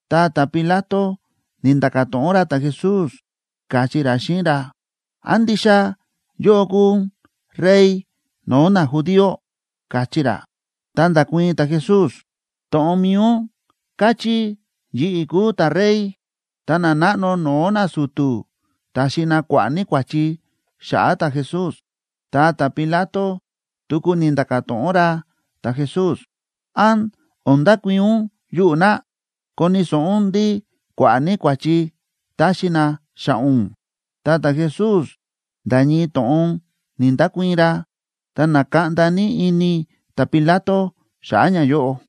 Ta ta̱Pilato ni̱nda̱ka̱ to̱ꞌon ra ta̱Jesús, káchí ra xíꞌin ra: ―¿Án ndixa yóꞌó kúu ún rey no̱o̱ najudío? ―káchí ra. Ta nda̱kuii̱n ta̱Jesús: ―To̱ꞌon mi̱i ún káchí yi̱ꞌi̱ kúu ta̱rey. Ta nanáꞌno no̱o̱ nasu̱tu̱ ta̱xi na kua̱ꞌa̱ ní kua̱chi xa̱ꞌa̱ ta̱Jesús. Ta ta̱Pilato tuku ni̱nda̱ka̱ to̱ꞌon ra ta̱Jesús: ―¿Án o̱n ndakuii̱n ún yuꞌu̱ na? ¡Koni̱ so̱ꞌo ún ndí kua̱ꞌa̱ ní kua̱chi táxi na xa̱ꞌa̱ ún! Ta ta̱Jesús nda̱ ñii to̱ꞌon ni̱‑ndakuii̱n ra. Ta na̱kaꞌnda ní ini ta̱Pilato xa̱ꞌa̱ ñayóꞌo.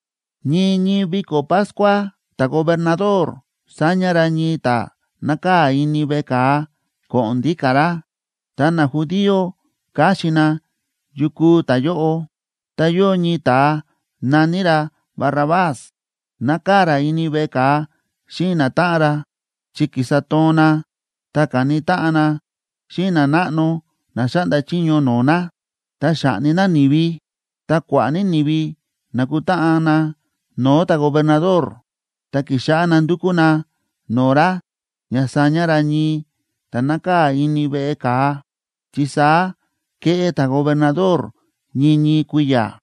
Ñii ñii viko̱ Pascua ta̱gobernador sáña ra ñii ta̱ nákaa̱ ini veꞌe ka̱a ko̱ꞌo̱n ndíka̱ ra. Ta najudío káxin na yu kúu ta̱yóꞌo. Ta yóo ñii ta̱a na̱ní ra Barrabás, nákaa̱ ra ini veꞌe ka̱a xíꞌin natáꞌan ra, chi ki̱sa toon na ta ka̱ni táꞌan na xíꞌin nanáꞌno na xáꞌnda chiño no̱o̱ na, ta xa̱ꞌni na ni̱vi. Ta kua̱ꞌa̱ ní ni̱vi na̱kutáꞌan na no̱o̱ ta̱gobernador, ta ki̱xáꞌá na ndúkú na no̱o̱ ra ña saña ra ñii ta̱ nákaa̱ ini veꞌe ka̱a, chi saá kéꞌé ta̱gobernador ñii ñii kui̱ya̱.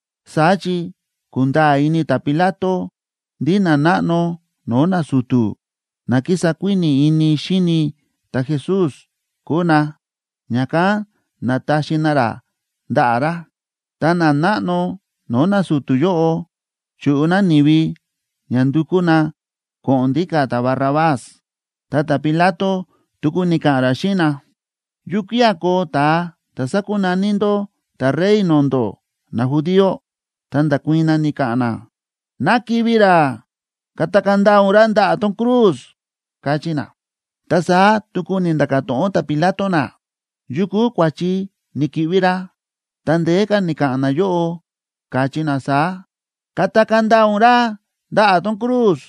Saá chi ku̱nda̱a̱ ini ta̱Pilato ndí nanáꞌno no̱o̱ nasu̱tu̱ na kísa kuíni̱ ini xíni ta̱Jesús kúu na, ña̱kán na̱taxi na ra ndaꞌa̱ ra. Ta nanáꞌno no̱o̱ nasu̱tu̱ yóꞌo chúꞌu na ni̱vi ña ndukú na ko̱ꞌo̱n ndíka̱ ta̱Barrabás. Ta ta̱Pilato tuku ni̱ka̱ꞌa̱n ra xíꞌin na: ―¿Yukía̱ koo ta̱a ta̱ sákunaní ndó ta̱Rey no̱o̱ ndó najudío? Ta nda̱kuii̱n na, ni̱ka̱ꞌa̱n na: ―¡Ná kivi̱ ra! ¡Katakaa̱ ndaa ún ra ndaꞌa̱ tón cruz! ―káchí na. Ta saá tuku ni̱nda̱ka̱ to̱ꞌon ta̱Pilato na: ―¿Yu kúu kua̱chi ni̱ki̱ꞌvi ra? Ta ndeé ka̱ ni̱ka̱ꞌa̱n nayóꞌo, káchí na saá: ―¡Katakaa̱ ndaa ún ra ndaꞌa̱ tón cruz!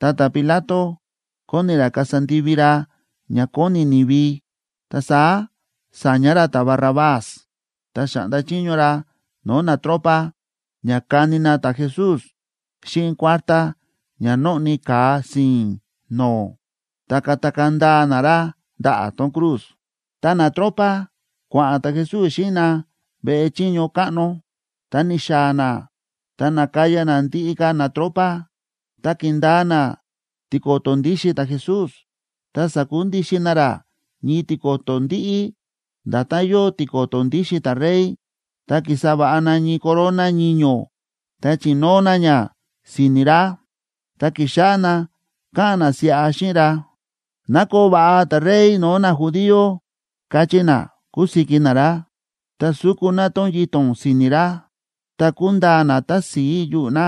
Ta ta̱Pilato kóni ra kasa ndivi ra ña kóni ni̱vi, ta saá sa̱ña ra ta̱Barrabás, ta xa̱ꞌnda chiño ra no̱o̱ natropa ña kani na ta̱Jesús xíꞌin kuártá ña nóꞌni ka̱a si̱i̱n no̱o̱, ta katakaa̱ ndaa na ra ndaꞌa̱ tón cruz. Ta natropa, kua̱ꞌa̱n ta̱Jesús xíꞌin na veꞌe chiño káꞌno, ta ni̱xaa̱ na ta na̱kaya na ndiꞌi ka̱ natropa. Ta ki̱ndaa na tiko̱to̱ ndíxin ta̱Jesús ta sa̱kundixin na ra ñii tiko̱to̱ ndíꞌí, nda̱tán yóo tiko̱to̱ ndíxin ta̱rey, ta ki̱sa va̱ꞌa na ñii corona ñiño̱ ta chi̱nóo na ña si̱ni̱ ra. Ta ki̱xáꞌá na káꞌa̱n na siꞌa xíꞌin ra: ―¡Ná koo va̱ꞌa ta̱Rey no̱o̱ najudío! ―káchí na, kúsiki na ra. Ta su̱ku na tón yito̱n si̱ni̱ ra, ta ku̱ndaa na tási̱i yuꞌu̱ na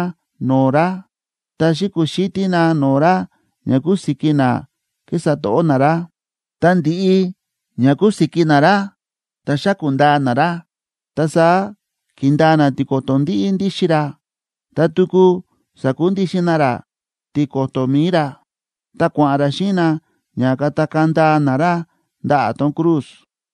no̱o̱ ra, ta xi̱kuxítí na no̱o̱ ra ña kusiki na kísa to̱ꞌó na ra. Tá ndi̱ꞌi ña ku̱siki na ra ta xa̱ku̱ ndaa na ra, ta saá ki̱ndaa na tiko̱to̱ ndíꞌí ndíxin ra, ta tuku sa̱kundixin na ra tiko̱to̱ mi̱i ra. Ta kua̱ꞌa̱n ra xíꞌin na ña katakaa̱ ndaa na ra ndaꞌa̱ tón cruz.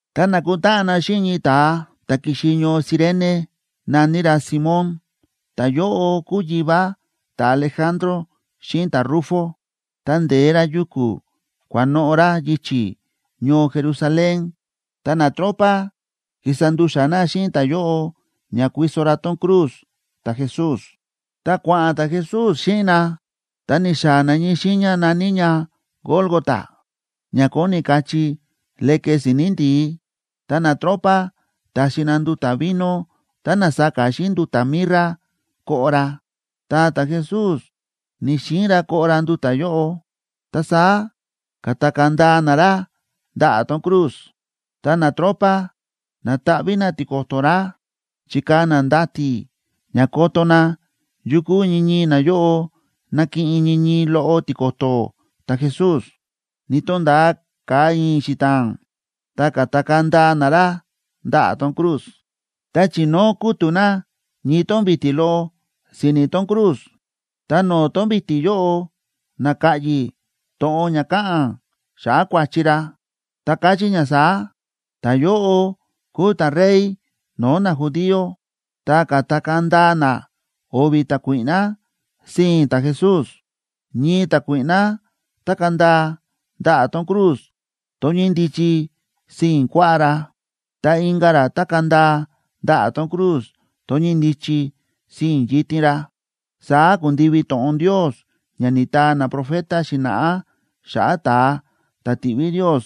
Ta na̱kutáꞌan na xíꞌin ñii ta̱a ta̱ ki̱xi ñoo Cirene na̱ní ra Simón, ta̱yóꞌo kúu yivá ta̱Alejandro xíꞌin ta̱Rufo, ta nde̱e ra yuku̱ kua̱noꞌo̱ ra yichi̱ ñoo Jerusalén. Ta natropa ki̱sa ndu̱xa̱ na xíꞌin ta̱yóꞌo ña kuiso ra tón cruz ta̱Jesús. Ta kua̱ꞌa̱n ta̱Jesús xíꞌin na, ta ni̱xaa̱ na ñii xiiña na̱ní ña Gólgota, ña kóni kachí Leke Si̱ni̱ Ndi̱í. Ta natropa ta̱xi na nduta̱ vino tá na̱saka xíꞌin nduta̱ mirra koꞌo ra, ta ta̱Jesús ni̱‑xiin ra koꞌo ra nduta̱ yóꞌo. Ta saá ka̱takaa̱ ndaa na ra ndaꞌa̱ tón cruz, ta natropa na̱taꞌví na tiko̱to̱ ra. Chi̱kaa̱ na ndati̱ ña koto na yukú ñii ñii nayóꞌo nakiꞌin ñii ñii loꞌo tiko̱to̱ ta̱Jesús. Ni̱to̱nda̱a ka̱a i̱i̱n xita̱a̱n,a ta ka̱takaa̱ ndaa na ra ndaꞌa̱ tón cruz. Ta chi̱nóo kútu̱ na ñii tón vi̱ti̱ loꞌo si̱ni̱ tón cruz, ta no̱o̱ tón vi̱ti̱ yóꞌo na̱ka̱ꞌyi̱ to̱ꞌon ña káꞌa̱n xa̱ꞌa̱ kua̱chi ra, ta káchí ña saá: “Ta̱yóꞌo kúu ta̱Rey no̱o̱ najudío.” Ta ka̱takaa̱ ndaa na o̱vi̱ ta̱kuíꞌná sii̱n ta̱Jesús, ñii ta̱kuíꞌná tákaa̱ ndaa ndaꞌa̱ tón cruz tón ñíndichi sii̱n kuaꞌá ra, ta inka̱ ra tákaa̱ ndaa ndaꞌa̱ tón cruz tón ñíndichi sii̱n yitin ra. Saá ku̱ndivi to̱ꞌon Ndios ña ni̱taa naprofeta xi̱na̱ꞌá xa̱ꞌa̱ ta̱a ta̱ tiꞌví Ndios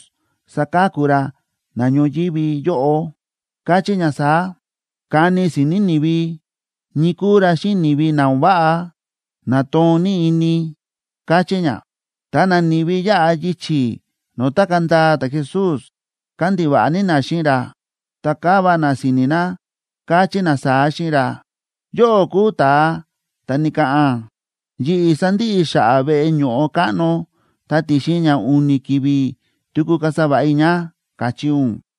saka̱ku ra na ñoyívi yóꞌo, káchí ña saá: “Kani si̱ni̱ ni̱vi ñii kúu ra xíꞌin ni̱vi na o̱n váꞌa, na toon ní ini”, káchí ña. Ta nani̱vi yáꞌa yichi̱ no̱o̱ tákaa̱ ndaa ta̱Jesús kándiva̱ꞌa ní na xíꞌin ra, ta káva na si̱ni̱ na, káchí na saá xíꞌin ra: ―Yóꞌó kúu ta̱a ta̱ ni̱ka̱ꞌa̱n: “Yi̱ꞌi̱ sandiꞌi i̱ xa̱ꞌa̱ veꞌe ño̱ꞌo káꞌno, ta ti̱xin ña u̱ni̱ ki̱vi̱ tuku kasa va̱ꞌa i̱ ña”, káchí ún,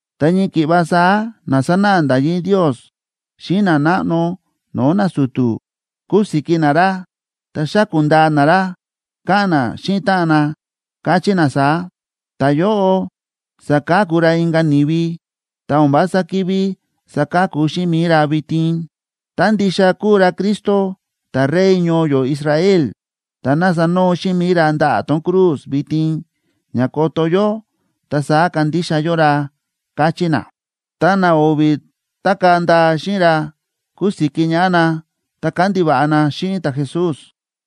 Ta ñii ki̱ꞌva saá na sánáꞌa nda̱yí Ndios xíꞌin nanáꞌno no̱o̱ nasu̱tu̱ kúsiki na ra ta xáku̱ ndaa na ra, káꞌa̱n na xíꞌin táꞌan na, káchí na saá: ―Ta̱yóꞌo sa̱ka̱ku ra inka̱ ni̱vi, ta o̱n vása ki̱ví saka̱ku xíꞌin mi̱i ra vitin. Tá ndixa kúu ra Cristo, ta̱Rey ñoo yó Israel, ta ná sanoo xíꞌin mi̱i ra ndaꞌa̱ tón cruz vitin ña koto yó, ta saá kandixa yó ra ―káchí na. Ta na o̱vi̱ tákaa̱ ndaa xíꞌin ra kúsiki ñaꞌá na ta kándiva̱ꞌa na xíꞌin ta̱Jesús.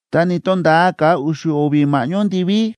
Ta ni̱to̱nda̱a ka̱a u̱xu̱ o̱vi̱ ma̱ꞌñó ndiví,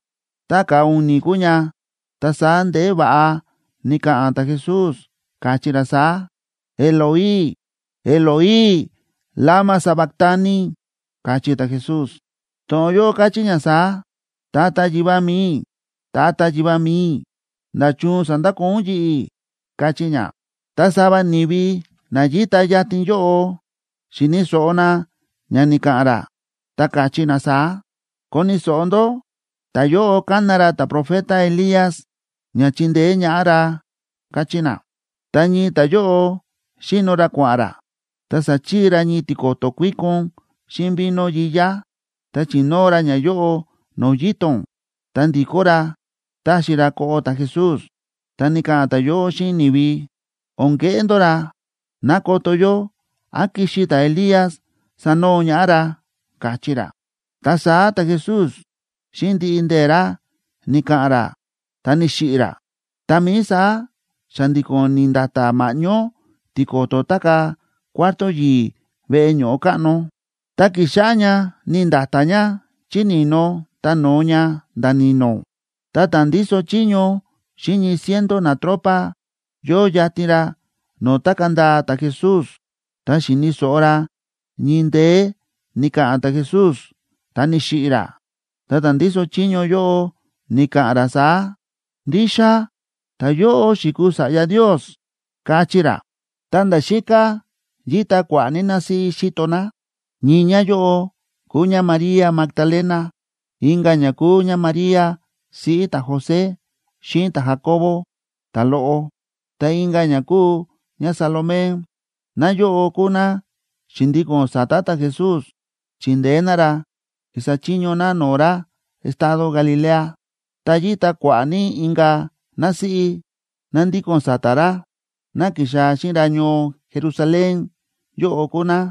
Ta ka̱a u̱ni̱ kúu ña, ta saá ndeé va̱ꞌa ni̱ka̱ꞌa̱n ta̱Jesús, káchí ra saá: ―Eloi, Eloi, ¿lama sabactani? ―káchí ta̱Jesús. To̱ꞌon yóꞌo káchí ña saá: Tata Yivá mi̱i i̱, Tata Yivá mi̱i i̱, ¿nda̱chun sa̱ndakoo ún yi̱ꞌi̱?, káchí ña. Ta sava ni̱vi na yíta yatin yóꞌo, xi̱ni̱ so̱ꞌo na ña ni̱ka̱ꞌa̱n ra, ta káchí na saá: ―Koni̱ so̱ꞌo ndó, ta̱yóꞌo kána ra ta̱profeta Elías ña chindeé ñaꞌá ra ―káchí na. Ta ñii ta̱yóꞌo xíno ra kua̱ꞌa̱n ra, ta sa̱chii ra ñii tiko̱to̱ kuíkon xíꞌin vino yiyá, ta chi̱nóo ra ñayóꞌo no̱o̱ yito̱n, ta ndi̱kó ra taxi ra koꞌo ta̱Jesús, ta ni̱ka̱ꞌa̱n ta̱yóꞌo xíꞌin ni̱vi: ―O̱n keꞌé ndó ra. Ná koto yó án kixi ta̱Elías sanoo ñaꞌá ra ―káchí ra. Ta saá ta̱Jesús xíꞌin ndiꞌi ndee̱ ra ni̱ka̱ꞌa̱n ra, ta ni̱xiꞌi̱ ra. Tá mií saá xa̱ndi̱ko̱n ni̱nda̱ta̱ ma̱ꞌñó tiko̱to̱ tákaa̱ cuarto yi̱i̱ veꞌe ño̱ꞌo káꞌno, ta ki̱xáꞌá ña ni̱nda̱ta̱ ña chí ni̱no ta no̱o ña nda̱ ni̱no̱. Ta ta̱ ndíso chiño xíꞌin ñii ciento natropa, yóo yatin ra no̱o̱ tákaa̱ ndaa ta̱Jesús, ta xi̱ni̱ so̱ꞌo ra ñii ndeé ni̱ka̱ꞌa̱n ta̱Jesús ta ni̱xiꞌi̱ ra, ta ta̱ ndíso chiño yóꞌo ni̱ka̱ꞌa̱n ra saá: ―Ndixa ta̱yóꞌo xi̱kuu Sa̱ꞌya Ndios ―káchí ra. Ta nda̱ xíká yíta kua̱ꞌa̱ ní násíꞌí xíto ná. Ñii ñáyóꞌo kúu ñáMaría Magdalena, inka̱ ñá kúu ñáMaría, siꞌí ta̱José xíꞌin ta̱Jacobo ta̱loꞌo, ta inka̱ ñá kúu ñáSalomé. Náyóꞌo kúu ná xi̱ndíko̱n sa̱ta̱ ta̱Jesús, chi̱ndeé ná ra, ki̱sa chiño ná no̱o̱ ra estado Galilea. Ta yíta kua̱ꞌa̱ ní inka̱ násíꞌí ná ndíko̱n sa̱ta̱ ra, ná ki̱xaa̱ xíꞌin ra ñoo Jerusalén yóꞌo kúu ná.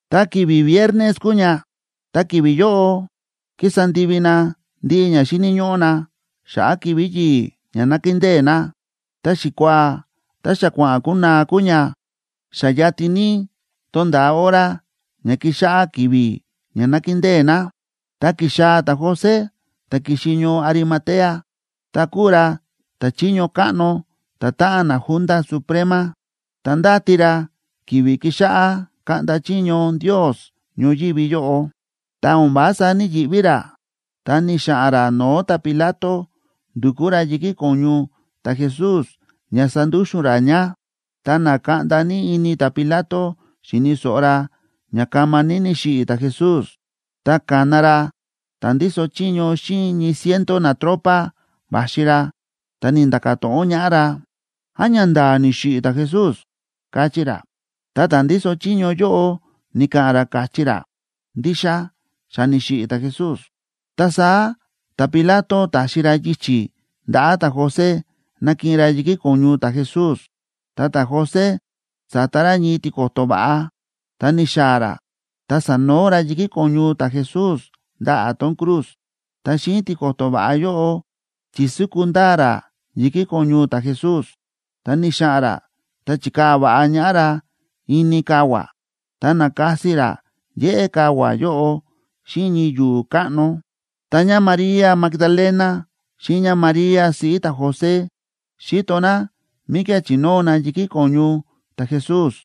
Ta ki̱vi̱ viernes kúu ña, ta ki̱vi̱ yóꞌo kísa ndivi na ndiꞌi ña xíni̱ ñóꞌó na xa̱ꞌa̱ ki̱vi̱ yi̱i̱ ña nákindée na. Ta xikuaa ta xa kua̱ꞌa̱n kunaa kúu ña, xa yatin ní tonda̱a hora ña kixáꞌá ki̱vi̱ ña nakindée na. Ta ki̱xaa̱ ta̱José, ta̱ ki̱xi ñoo Arimatea, ta kúu ra ta̱chiño káꞌno ta̱táꞌan naJunta Suprema. Ta ndáti ra ki̱vi̱ kixáꞌá kaꞌnda chiño Ndios ñoyívi yóꞌo. Ta o̱n vása ní‑yiꞌví ra, ta ni̱xa̱ꞌa̱n ra no̱o̱ ta̱Pilato ndu̱kú ra yi̱kí ko̱ñu ta̱Jesús ña sandúxu̱n ra ña. Ta na̱kaꞌnda ní ini ta̱Pilato xíni̱ so̱ꞌo ra ña kama ní ni̱xiꞌi̱ ta̱Jesús, ta ka̱na ra ta̱ ndíso chiño xíꞌin ñii ciento natropa va̱xi ra, ta ni̱nda̱ka̱ to̱ꞌon ñaꞌá ra: ―¿Án ñanda̱a̱ ni̱xiꞌi̱ ta̱Jesús? ―káchí ra. Ta ta̱ ndíso chiño yóꞌo ni̱ka̱ꞌa̱n ra, káchí ra: ―Ndixa xa ni̱xiꞌi̱ ta̱Jesús. Ta saá ta̱Pilato ta̱xi ra yichi̱ ndaꞌa̱ ta̱José nakiꞌin ra yi̱kí ko̱ñu ta̱Jesús. Ta ta̱José sa̱ta ra ñii tiko̱to̱ va̱ꞌa, ta ni̱xaa̱ ra ta sa̱noo ra yi̱kí ko̱ñu ta̱Jesús ndaꞌa̱ tón cruz, ta xíꞌin tiko̱to̱ va̱ꞌa yóꞌo chi̱súku ndaa ra yi̱kí ko̱ñu ta̱Jesús. Ta ni̱xa̱ꞌa̱n ra ta chi̱kaa̱ va̱ꞌa ñaꞌá ra ini kavua̱, ta na̱kasi ra yéꞌé kavua̱ yóꞌo xíꞌin ñii yu̱u̱ káꞌno. Ta ñáMaría Magdalena xíꞌin ñáMaría siꞌí ta̱José xi̱to ná míkía̱ chi̱nóo na yi̱kí ko̱ñu ta̱Jesús.